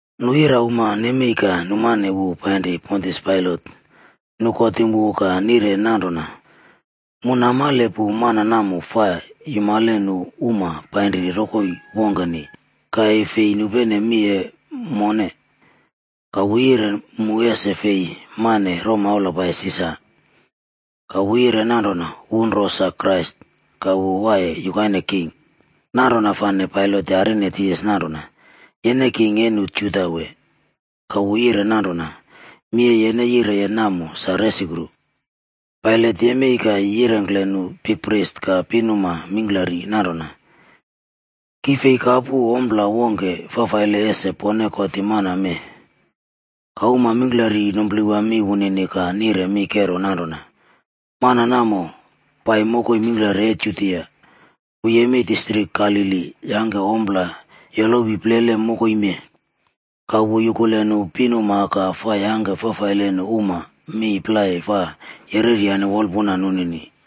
Nu irauma nemei ka numane wu painri Pontius Pailat. Nu kotim wu ka nire nanrona, “Mu namale pu mana namo fa yumale nu uma painri rokoi wongkeni ka e fi nupene mi e mone. Ka wu yire mu ese fi maꞌne romaula pai Sisar.a Ka wu yire nanrona wu nro sa Krais ka wu waiye yukaine king.” Nanrona fane Pailat yarine Jisas nanrona, “Yene king e nu Juda wee?” Ka wu yire nanrona, “Mi e yene yireye namo sa resukru.” Pailat yemei ka yirengkle nu bikpris ka pinuma mingklari nanrona, “Ki fi kapu ompla wongke fafaile ese pone kotim mana mee.” Ka uma mingklari numplewa mi wunini ka nire mi kero nanrona, “Mana namo pai mokoi mingklari e Judia. Wu yemei distrik Galili yangke ompla yolowi plele mokoi mee. Ka wu yukule nu pinuma ka fa yangke fafaile nu uma mi plai fa yereryane wolpuna nunini.”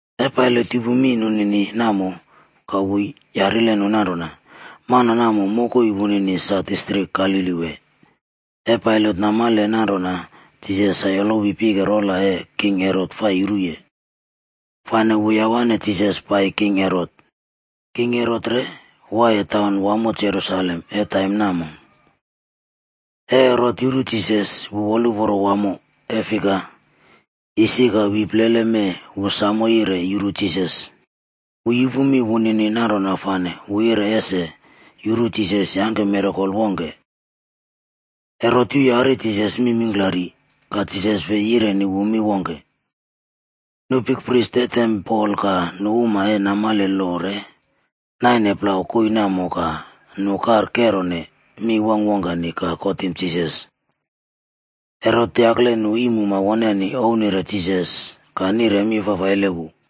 E Pailat yupu mi nunini namo ka wu yarile nu nanrona, “Mana namo mokoi wunini sa distrik Galili wee?” E Pailat namale nanrona Jisas sa yolowi pike rola e king Herot fa yuruye, fane wu yawane Jisas pai king Herot. King Herot re waiye taun wamo Jerusalem e taim namo. E Herot yuru Jisas wu woluporo wamo, e fika, isi ka wi plele mee wu samo yire yuru Jisas. Wu yupu mi wunini nanrona fane wu yire ese yuru Jisas yangke mirakol wongke. Herot yuyari Jisas mi mingklari, ka Jisas fi yireni wu mi wongke. Nu bikpris e tempol ka nu uma e namale lo re, naine plau koii namo ka nu kar kerone mi wongkwongkeni ka kotim Jisas. Herot yakle nu iimuma woneni ouwnire Jisas ka nire mi fafaile wu.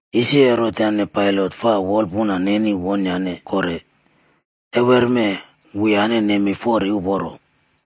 Isi Herot yane Pailat fa wolpuna nenine wonyane kore, e wermee, wuyane nemei fori uporo.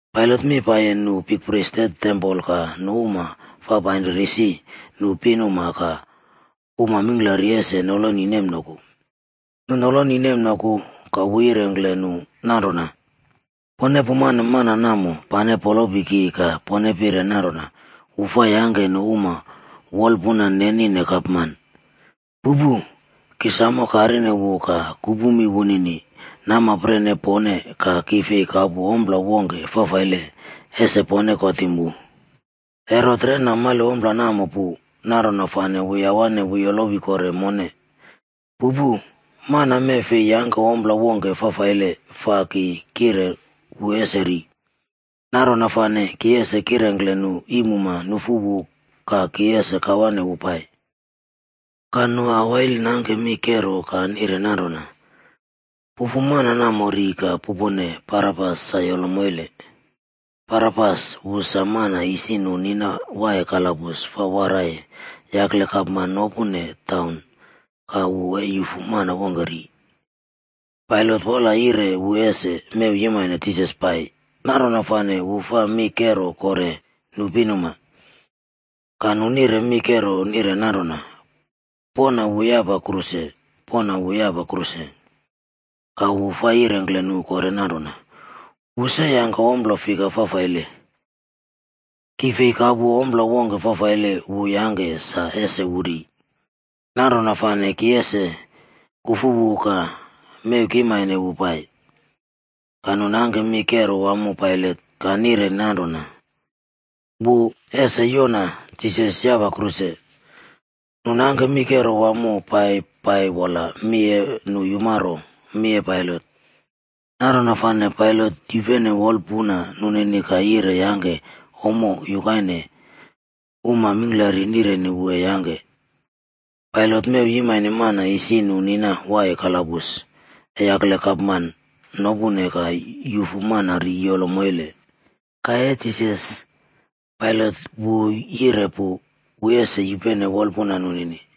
Pailat mi paiye nu bikpris e tempol ka nu uma fa painri risi nu pinuma ka uma mingklari ese noloni nemnoku. Nu noloni nemnoku ka wu yirengkle nu nanrona, “Pone pumane mana namo pane polopi ki ka pone pire nanrona wu fa yangke nu uma wolpuna nenine gapman. Pupu! Ki samo karine wu ka kupu mi wunini namapren e pone ka ki fei kapu ompla wongke fafaile, ese pone kotim wu. Herot re namale ompla namo pu, nanrona fane wu yawane wu yolowi kore mone. Pupu. Mana mee fi yangke ompla wongke fafaile fa ki kire wu ese ri. Nanrona fane ki ese kirengkle nu iimuma nufu wu ka ki ese kawane wu pai.”c Ka nu awail nangke mi kero ka nire nanrona, “Pufu mana namo ri ka pupone Barabas sa yolo moile.” Barabas wu sa mana isi nu nina waiye kalabus fa waraiye yakle gapman nopune taun ka wu e yufu mana wongke ri. Pailat wola yire wu ese mew yimane Jisas pai, nanrona fane wu fa mi kero kore nu pinuma. Ka nu nire mi kero nire nanrona, “Poꞌna wu yapa kruse! Poꞌna wu yapa kruse!” Ka wu fa yirengkle nu kore nanrona, “Wu se yangke ompla fika fafaile? Ki fei kapu ompla wongke fafaile wu yangke sa ese wu ri. Nanrona fane ki ese kufu wu ka mew kimane wu pai.” Ka nu nangke mi kero wamo Pailat ka nire nanrona, wu ese yoꞌna Jisas yapa kruse. Nu nangke mi kero wamo pai pai wola mi e nu yumaro mi e Pailat. Nanrona fane Pailat yupene wolpuna nunini ka yire yangke ommo yukaine uma mingklari nireni wu e yangke. Pailat mew yimane mana isi nu nina waiye kalabus e yakle gapman nopune ka yufu mana ri yolo moile. Ka e Jisas, Pailat wu yire pu wu ese yupene wolpuna nunini.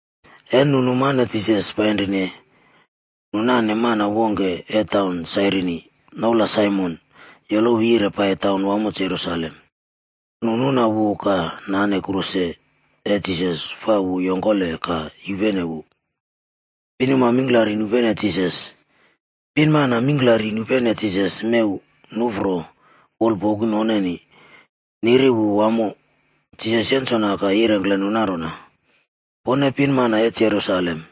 E nu numane Jisas painrine, nu nane mana wongke e taun Sairini, noula Saimon yolowi yire pai taun wamo Jerusalem. Nu nuna wu ka nane kruse e Jisas fa wu yongkole ka yupene wu. Pinuma mingklari nupene Jisas. Pinmana mingklari nupene Jisas mew nuꞌfro wolpoku noneni, niri wu wamo. Jisas yensona ka yirengkle nu nanrona, “Pone pinmana e Jerusalem,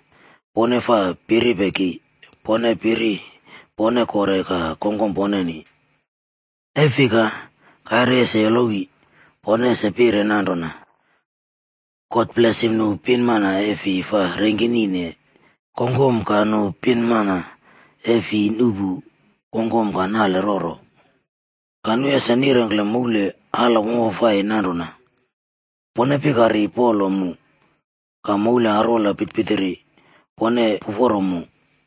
pone fa piripe ki, pone piri pone kore ka kongkom poneni. E fika, kaire ese yolowi, pone ese pire nanrona, ‘God blesim nu pinmana e fi fa rengkinine kongkom ka nu pinmana e fi nuꞌpu kongkom ka nale roro.’ ‘Ka nu ese nirengkle moul ala wamfafai nanrona: “Pone pikari polo mu!” Ka moul arwola pitirpitiri: “Pone puforo mu!” ’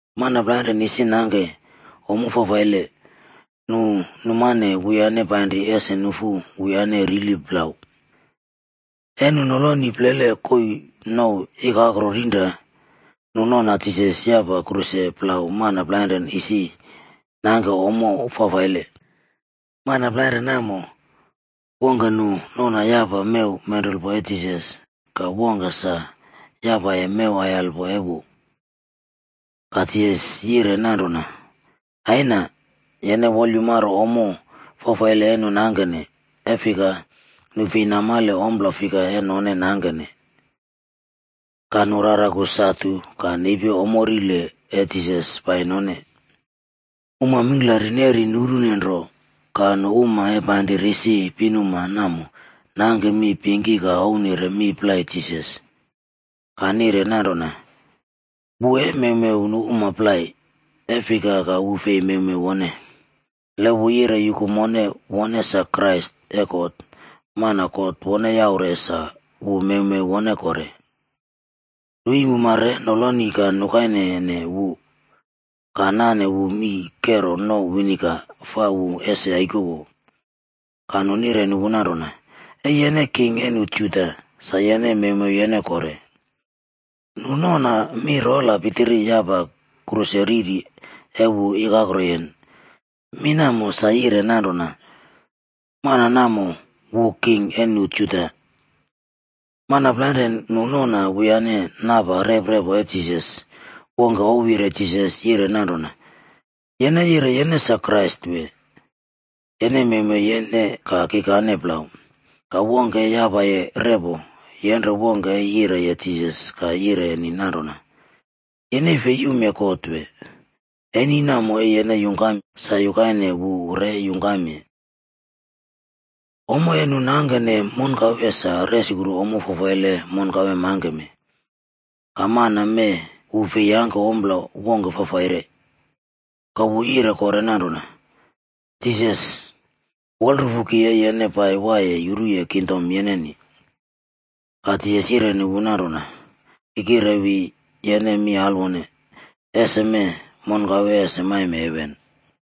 Mana plainrane isi nangke ommo fafaile, nu numane wuyane painri ese nufu wuyane rili plau. E nu noloni plele koii nouw Ikakro Rinra, nu noꞌna Jisas yapa kruse plau mana plainre isi nangke ommo fafaile. Mana plainre namo, wongke nu noꞌna yapaye mew menrulpo e Jisas ka wongke sa yapaye mew aiyalpo e wu. Ka Jisas yire nanrona, “Aina, yene wolyumaro ommo fafaile e nu nangkene. E fika, nu fei namale ompla fika e none nangkene.” Ka nu raraku satu ka nepi ommo rile e Jisas pai none. Uma mingklari neri nurune nro, ka nu uma e painri risi pinuma namo nangke mi pingki ka ouwnire mi plai Jisas. Ka nire nanrona, “Wu e mewmew nu uma plai, e fika ka wu fei mewmew wone. Le wu yire yuku mone wone sa Krais e God, mana God wone yaure sa wu mewmew wone kore.” Nu iimuma re noloni ka nukainene wu, ka nane wu mii kero nouw viniga fa wu ese yaikowo. Ka nu nireni wu nanrona, “E yene king e nu Juda, sa yene mewmew yene kore.” Nu noꞌna mi rola pitiri yapa kruse riri e wu ikakro yen. Mi namo sa yire nanrona: MANA NAMO WU KING E NU JUDA. Mana plainrane nu noꞌna wuyane napa rep repo e Jisas, wongke ouwyire Jisas yire nanrona, “Yen yire yene sa Krais wee? Yene mewmew yene ka kikane plau!” Ka wongke e yapaye repo, yenre wongke e yireye Jisas ka yireni nanrona, “Yene fei yumye God wee? Eni namo e yene yungkam, sa yukaine wu re yungkamye. Ommo e nu nangkene monkawe sa resukru ommo fafaile e monkawe mangkeme. Ka mana mee wu fi yangke ompla wongke fafaire.” Ka wu yire kore nanrona, “Jisas, wolrufu ki e yene pai waiye yuruye kingdom yeneni.” Ka Jisas yireni wu nanrona, “Ki kirewi yene mi alwone, esemee monkawe ese maime heven.”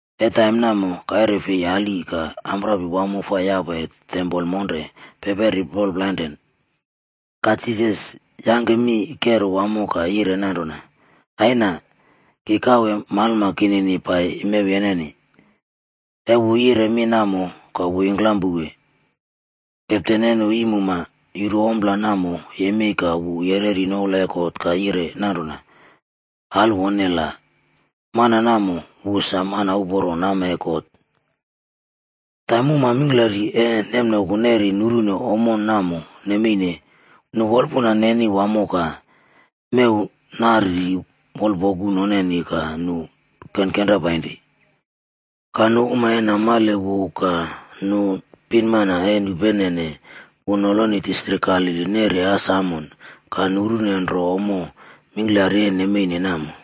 E taim namo kaire fei ali ka amprapi wamo fa yapaye tempol monre peperi plol plainre. Ka Jisas yangke mi kero wamo ka yire nanrona, “Aina, ki kawe malma kinini pai mew yeneni.” E wu yire mi namo ka wu yingklam pouwe. Kepten e nu iimumae yuru ompla namo yemei ka wu yereri noula e God ka yire nanrona, “Alwone la, mana namo wu sa mana uporo nama e God.” Taim uma mingklari e nemnoku neri nurune ommo namo nemeine, nu wolpuna eni wamo ka mew nariri wolpoku noneni ka nu kenkenra painri. Ka nu uma e namale wu ka nu pinmana e nupenene wu noloni distrik Galili neri as amon ka nurune nro ommo mingklari e nemeine namo.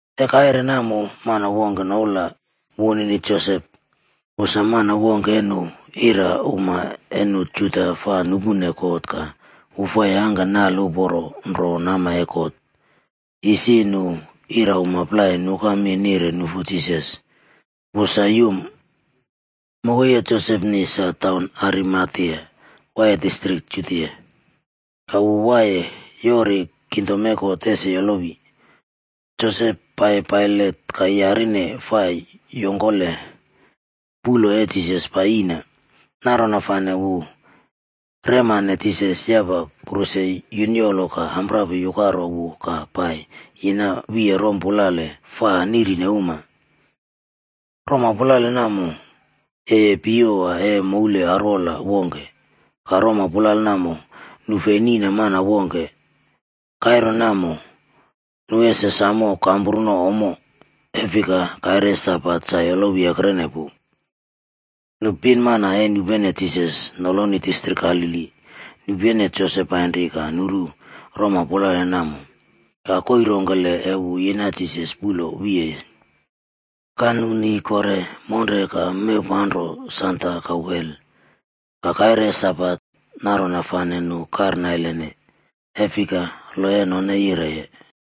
E kaire namo mana wongke noula wunini Josep, wu sa mana wongke e nu irauma e nu Juda fa nupune kot ka wu fa yangke nale uporo nro nama e God. Isi nu irauma plai nuka mi nire nufu Jisas, wu sa yum. Mokoi e Josepni sa taun Arimatea, waiye distrik Judia. Ka wu waiye yori kingdom e God ese yolowi. Josep pai Pailat ka yarine fa yongkole puꞌlo e Jisas pai yiꞌna. Nanrona fane wu remane Jisas yapa kruse yunyolo ka amprapi yukaro wu ka pai yina wiye roma pulale fa nirine uma. Roma pulale namo, yeye piyewa e moul arwola wongke. Ka rompulale namo, nu fei niꞌna mana wongke. Kaire namo nu ese samo kampruno ommo, e fika kaire e Sabat sa yolowi ekrene pu. Nu pinmana e nupenene Jisas noloni distrik Galili nupene Josep painri ka nuru roma pulale namo, ka koii rongkele e wu yina Jisas puꞌlo wiyeye. Ka nu ni kore monre ka mewpanro sanda ka wel. Ka kaire e Sabat, nanrona fane nu karnailene. E fika lo e none yireye.